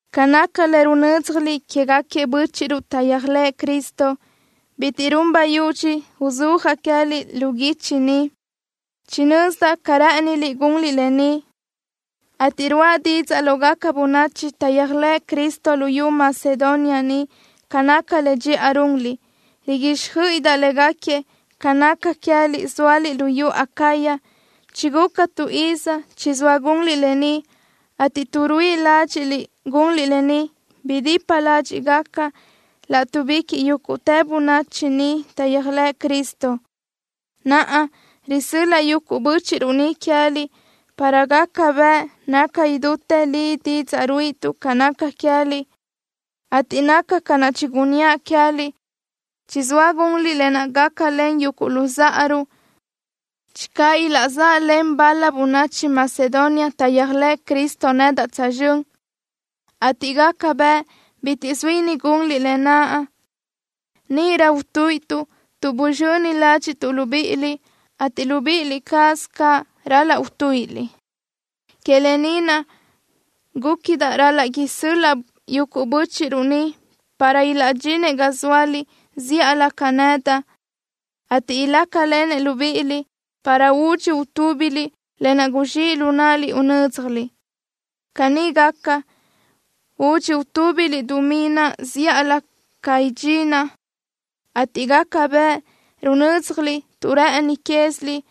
Ca naca le runö́dzjaliʼ quégaquiëʼ bö́chiʼruʼ taʼyéajlëʼë Cristo, bitiʼ run bayudxi uzúajaʼ queë́liʼ lu guichi ni. Chinözdaʼ ca rë́ʼëniliʼ gunliʼ lë ni, ateʼ ruáʼa didzaʼ lógaca bönachi taʼyéajlëʼ Cristo luyú Macedonia ni ca naca le dxiʼa runliʼ. Riguíxjöiʼidaʼ légaquiëʼ ca naca queë́liʼ, zóaliʼ luyú Acaya, chiguca tu iz chizóa gunliʼ lë ni, ateʼ tuʼ ruíʼi ládxiʼliʼ gunliʼ lë ni, bidipa ládxiʼgaca láʼtuʼbiquiʼ yúguʼtë bönachi ni taʼyéajlëʼ Cristo. Naʼa, risö́l-laʼa yuguʼ bö́chiʼruʼ ni queë́liʼ para gaca bëʼ naca idútë li didzaʼ ruíʼituʼ ca naca queë́liʼ, ateʼ naca ca naʼ chigunníaʼ queë́liʼ, chizóa gunliʼ lë naʼ gácalen yuguʼ luzáʼaruʼ. Channö ilaʼzáʼalen bal-la bönachi Macedonia taʼyéajlëʼ Cristo nedaʼ tsözxö́n, ateʼ gaca bëʼ bitiʼ zuíni gunliʼ lë naʼ, níʼirö utuíʼituʼ tuʼ buzxöni ládxiʼtuʼ libíʼiliʼ, ateʼ libíʼi cázaliʼ caʼ ral-laʼ utuíʼiliʼ. Que lë ni naʼ gúquidaʼ ral-laʼ isö́l-laʼa yuguʼ bö́chiʼruʼ ni para ilaʼdxinëʼ ga zóaliʼ zíʼalö ca nedaʼ, ateʼ ilácalenëʼ libíʼiliʼ para udxi utúbiliʼ lë naʼ guzxíʼ lu náʼaliʼ unö́dzjaliʼ. Caní gaca, údxi utúbiliʼ dumí naʼ zíʼalö ca idxinaʼ, ateʼ gaca bëʼ runö́dzjaliʼ tuʼ rë́ʼëni cázaliʼ,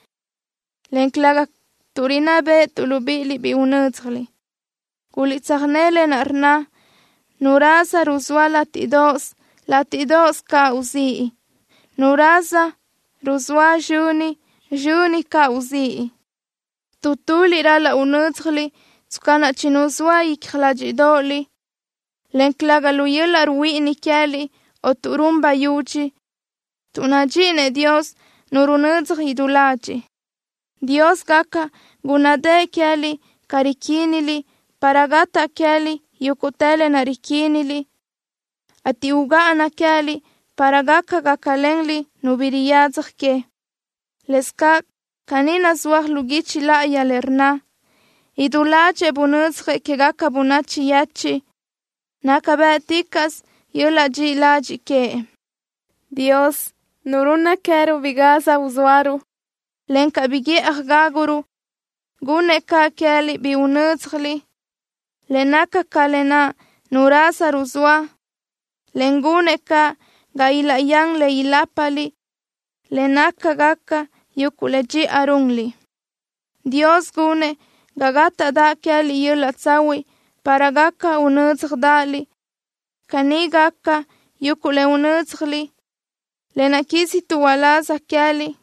en calëga tuʼ rinná béʼetuʼ libíʼiliʼ bi unö́dzjaliʼ. Guliʼtsöjné lë naʼ rnna: Nu raza ruzóa látiʼdoʼos, látiʼdoʼos caʼ uzíʼ. Nu raza ruzóa sizxöni, sizxöni caʼ uzíʼ. Tu tuliʼ ral-laʼ unö́dzjaliʼ tsca naʼ chinuzóaliʼ icja ládxiʼdoʼoliʼ, en calëga lu yöl-laʼ ruhuíʼini queë́liʼ o tuʼ run bayudxi, tuʼ nadxíʼinëʼ Dios nu runödzaj idú ladxiʼ. Dios gaca gúnnadëʼë queë́liʼ ca riquíniliʼ para gataʼ queë́liʼ yúguʼtë lë naʼ riquíniliʼ, ateʼ ugáʼana queë́liʼ para gaca gácalenliʼ nu bi riyadzaj que. Lëscaʼ caní nazúaj lu guichi láʼayi le rnna: Idú ládxëʼë bunödzjëʼ quégaca bönachi yechiʼ. Naca bë́ʼticaʼsö yöl-laʼ dxiʼi ladxiʼ queëʼ. Dios, Nu runna queë́ruʼ bi gaz uzóaruʼ, encaʼ bi guíʼaj gáguruʼ, gunnëʼ caʼ queë́liʼ bi unö́dzjaliʼ, le naca ca lë naʼ nu raza ruzóa, en gunëʼ caʼ ga ilaʼyán le ilápaliʼ le nácagaca yuguʼ le dxiʼa runliʼ. Dios gunëʼ ga gátaʼdaʼ queë́liʼ yöl-laʼ tsahuiʼ para gaca unö́dzjadaʼaliʼ. Caní gaca, yuguʼ le unö́dzjaliʼ, lë naʼ quísituʼ uláz queë́liʼ,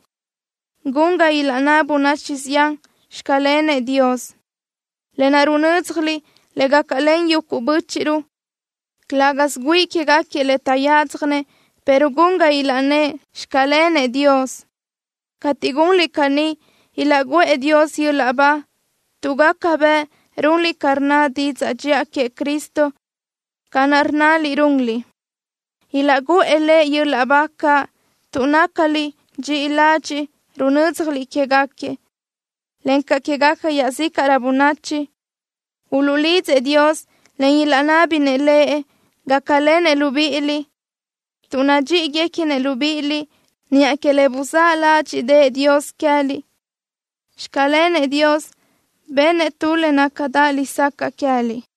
gun ga ilaʼnná bönachi zián: “Xclenëʼ Dios.” Lë naʼ runö́dzjaliʼ le gácalen yuguʼ bö́chiʼruʼ, calë́gasö güíʼi quégaquiëʼ le taʼyádzjanëʼ, pero gun ga ilaʼnnë́ʼ: “Xclenëʼ Dios.” Cateʼ gunliʼ caní, ilaʼguʼë Dios yöl-laʼ ba tuʼ gaca bëʼ runliʼ ca rnna didzaʼ dxiʼa queëʼ Cristo ca naʼ rnnaliʼ runliʼ. Ilaʼguʼë Lëʼ yöl-laʼ ba caʼ, tuʼ nácaliʼ dxiʼi ladxiʼ, runö́dzjaliʼ quégaquiëʼ, encaʼ quégaca iaʼzícaʼrö bönachi. Uluʼlidzëʼ Dios, en ilaʼnábinëʼ Lëʼ gácalenëʼ libíʼiliʼ tuʼ nadxíʼiguequinëʼ libíʼiliʼ niʼa que le buzáʼ ládxiʼdëʼë Dios queë́liʼ. ¡Xclenëʼ Dios, bennëʼ tu le nácadaʼ lesacaʼ queë́liʼ!